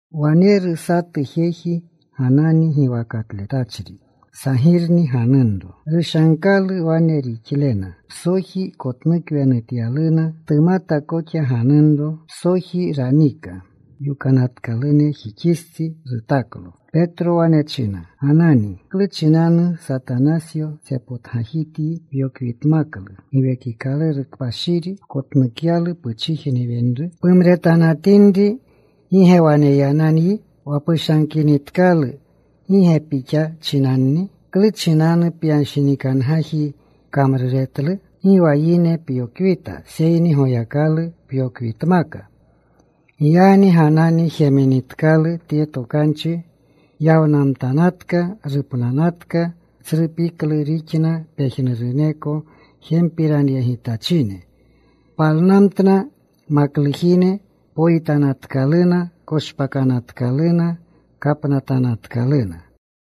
Waneru satu jeji Ganani giwakatletachri. Sagirni ganunro. Rushankalu wane rixlena. Psoji kotnukwenutyaluna. Tumata koxa ganunro. Psoji ranika. Yokanatkalunjixistsi rutaklo. Petro wane china, “Ganani, ¿klu chinanu Satanasyo tsepotgajityi pyokwitmaklu Giwekikaluru Kpashiri, pkotnukyalu puchijne wenru? Pumretanatinri ¿gi ge waneyananyi? Wa pushankinitkalu ¿gi ge pixa chinanni? ¿Klu chinanu pyanshinikangaji kamruretlu? Gi wa yine pyokwita seyni Goyakalu pyokwitmaka.” Giyagni Ganani jeminitkalu tye tokanchi, yawnamtanatka. Rupnanatka. Tsru piklu rixna pejnuruneko jempiranyegitachine. Palnamtna maklujine. Poyitanatkaluna. Koshpakanatkaluna. Kapnatanatkaluna.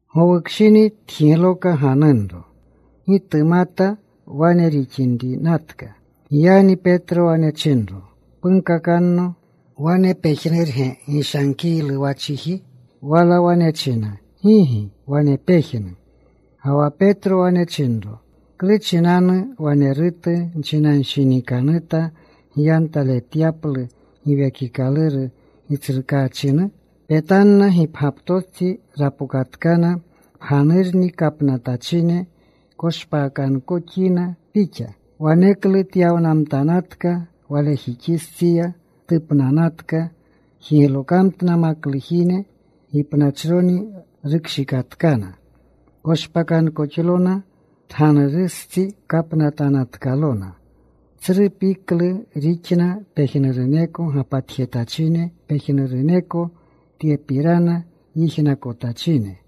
Gowukshini tjigloka ganunro. Gi tumata wane rixinrinatka. Giyagni Petro wane chinro, “Punkakanno. ¿Wane pejnurge gishankiylu wa chiji?” Wala wane china, “Gigi. Wane pejnu.” Ga wa Petro wane chinro, “¿Klu chinanu wanerutu nchinanshinikanuta gyantaletyaplu Giwekikaluru Gitsrukaachinu? Petanna gipgyaptostsi rapokatkana pganurni kapnatpachine. Koshpakankoxyina pixa.” Waneklu tyawnamtanatka walejixistsiya. Tupnanatka. Jiglokamtna maklujine. Gipnachroni rukshikatkana. Koshpakanatkalona. Tganurustsi kapnatanatkalona. Tsru piklu rixna pejnuruneko gapatjetachine, pejnuruneko tyepirana yijnakotachine.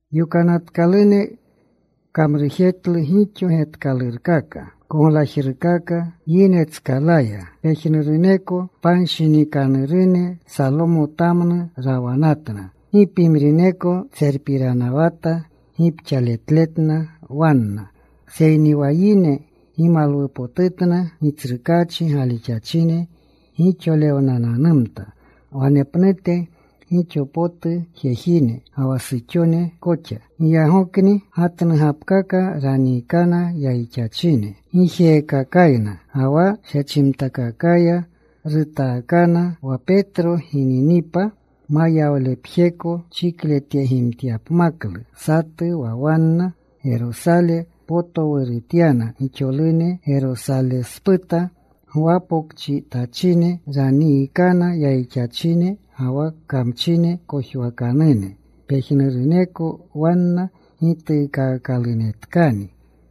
Yokanatkalune kamrujetlu gixo getkalurkaka, koglajrukaka yinetskalaya. Pejnuruneko panshinikanurune Salomotamnu rawanatna. Gi pimrineko tserpiranawata gipxaletletna wanna, seyni wa yine gimalwupotutna. Gitsrukaachi galixachine gixolewnananumta wanepnute gixo potu jejine, ga wa suxone koxa. Giyagokni gatnugapkaka raniikana yayixachine. Gijeekakayna ga wa shechimtakakaya rutaakana, wa Petro gininipa mayawlepjeko chikletyegimtyapmaklu satu wa wanna. Gerosale potowrurutyana gixolune Gerosalesputa gwapokchijetachine. Raniikana yayixachine ga wa kamchine kojwakanune. Pejnuruneko wanna gituukaakalunetkani.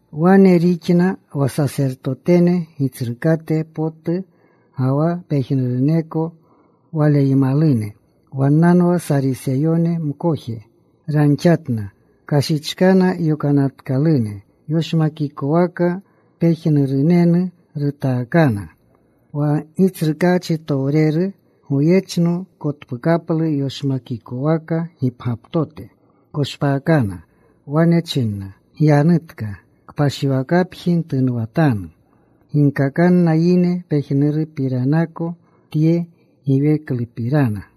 Wane rixna wa Sasertotene Gitsrukate potu ga wa pejnuruneko waleymalune. Wannanwa Sariseyone mkoje. Ranxatna. Kashichkana yokanatanune. Yoshmakikowaka pejnurunenu rutaakana. Wa Gitsrukaachitowreru goyechno kotpukaplu yoshmakikowaka gipgyaptote. Koshpakna. Wane china, “Gyanutka. Kpashiwakapji ntunwatanu. Ginkakanna yine pejnupiranako tye giweklupirana.”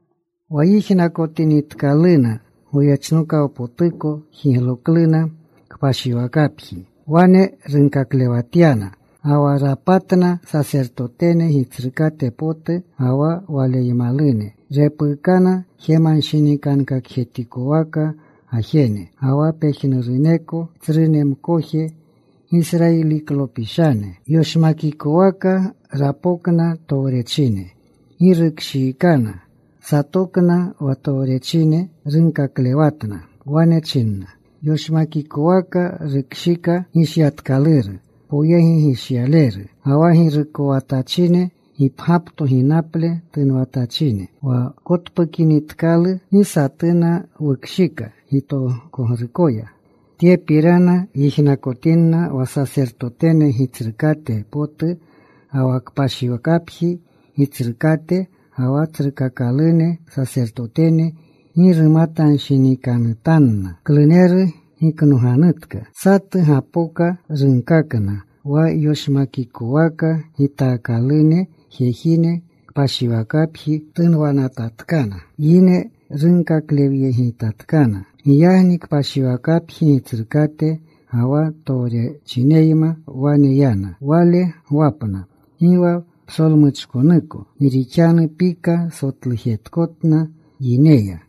Wa yijnakotinitkaluna goyechnokawpotuko jiglokluna kpashiwakapji. Wane runkaklewatyana. Ga wa rapatna sasertotene gitsrukate potu ga wa waleymalune. Repuukana jemanshinikankakjetikowaka gajene, ga wa pejnuruneko tsrune mkoje Gisrayiliklopishane. Yoshmakikowaka rawapjixikna. Yoshmakikowaka rapokna towrechine. Gi rukshiikana. Satokna wa towrechine. Runkaklewatna. Wane china, “Yoshmakikowaka wukshika gishyatkaluru poyegishyaleru, ga wa girukowatachine gipgyapto ginaple tunwatachine. Wa wkotpukinitkalu gi satuna wukshika gitokogrukoya.” Tyepirana yijnakotinna wa sasertotene gitsrukate potu ga wa kpashiwakapji gitsrukate, ga wa tsrukakalune sasertotene gi rumatanshinikanutanna kluneru giknoganutka. Satu gapoka. Runkakna, “Wa yoshmakikowaka gitakanune jejine, kpashiwakapji tunwanatatkana. Yine runkaklewyeginatkana.” Giyagni kpashiwakapji gitsrukate ga wa towrechineyma wane yana. Wale gwapna. Gi wa psolmuchkonuko, gi rixanu pika sotlujetkotna yineya.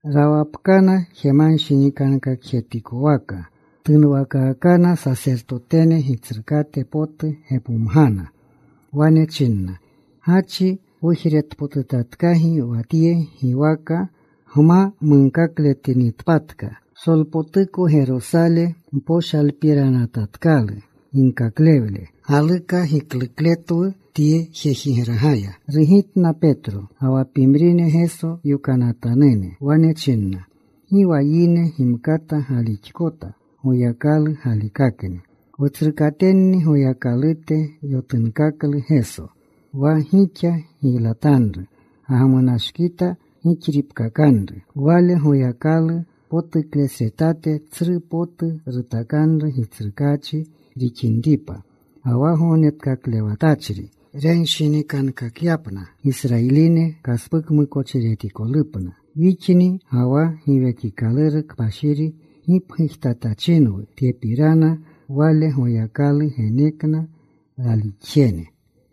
Rawapkana. Jemanshinikankakjetikowaka tunwakaakana. Sasertotene gitsrukate potu gepomgana. Wane china, “Gachi wujretpotutatkagi wa tye giwaka gma munkakletinitpatka. Psolpotuko Gerosale mposhalpiranatatkalu ginkaklewle. Galuka giklukletwu tye jejigragaya.” Rugitna Petro ga wa pimrine Geso yokanatanune. Wane chinna, “Gi wa yine gimkata galixkota. Goyakalu galikakni. “Wutsrukatenni Goyakalute yotunkaklu Geso, wa gixa giylatanru. Gagmunashkita gixripkakanru. Wale Goyakalu potuklesretate tsru potu rutakanru Gitsrukaachi rixinripa ga wa Gognetkaklewatachri, renshinikankakyapna Gisrayiline kaspukamukochiretikolupna. Wixni ga wa Giwekikaluru Kpashiri gipgujtatachinwu tyepirana. Wale Goyakalu genekna ralixjene.”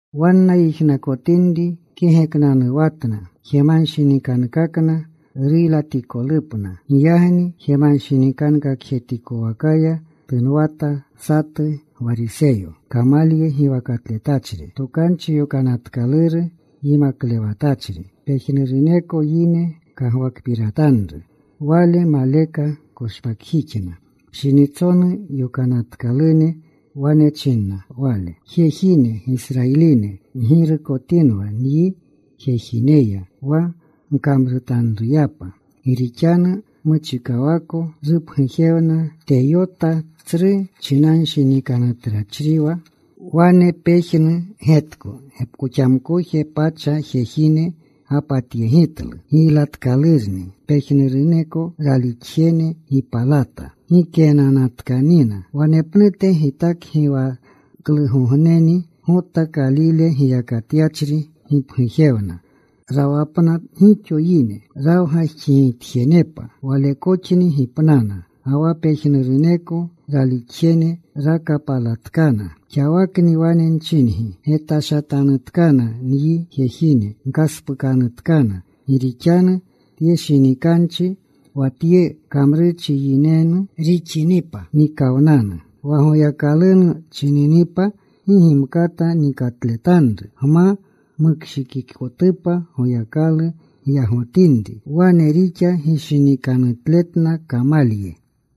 Wanna yijnakotinri kegeknanuwatna. Jemanshinikankakna ruylatikolupna. Giyagni jemanshinikankakjetikowakaya tunwata satu Gwariseyo, Kamalye giwakatletachri. Tokanchi Yokanatkaluru yimaklewatachri. Pejnuruneko yine kagwakpiratanru. Wale maleka koshpakjixna pshinitsonu yokanatkalune. Wane chinna wale, “Jejine, Gisrayiline, ggirukotinwa nyi jejineya wa gkamrutanruyapa. Gi rixanu muchikawako rupgujewna Teyota. Tsru chinashatnachriwa. Wane pejnu getko gepkoxamkoje pacha jejine gapatyegitlu. Giylatkalurni. Pejnuruneko ralixjene gipalata. Gikeenanatkanina. Wanepnute gitakgiwaakaklugogneni Gota Kalile giyakatyachri gipgujewna. Rawapna gixo yine rawgajxigitjenepa. Walekoxni gipnana. Ga wa pejnuruneko ralixjene rakapalatkana. Xawakni wane nchingi, getashatanutkana nyi jejine. Gkaspukanutkana. Gi rixanu tye shinikanchi, wa tye kamrurchi yinenu rixinipa nikawnanu. Wa Goyakalunu chininipa gi gimkata nikatletanru, gma mukshikikotupa Goyakalu gyagotinri.” Wane rixa gishinikanutletna Kamalye.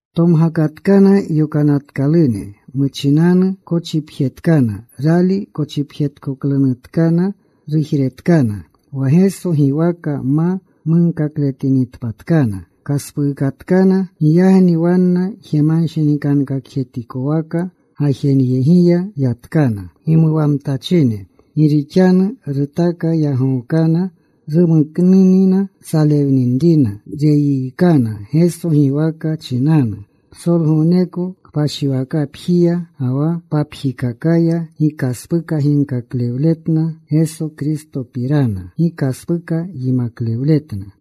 Tomgakatkana yokanatkalune. Muchinanu kochipjetkana. Rali kochipjeretkoklunutkana, rujretkana wa Geso giwaka ma munkakletinitpatkana. Kaspuukatkana. Giyagni wanna jemanshinikankakjetikowaka gajenyegiya yatkana gimuwamtachine, gi rixanu rutaka yagookana rumuknina salewninrina, reyiikana Geso giwaka chinanu. Psolgogneko kpashiwakapjiya ga wa papjikakaya gi kaspuka ginkaklewletna Geso Kristopirana, gi kaspuka yimaklewletna.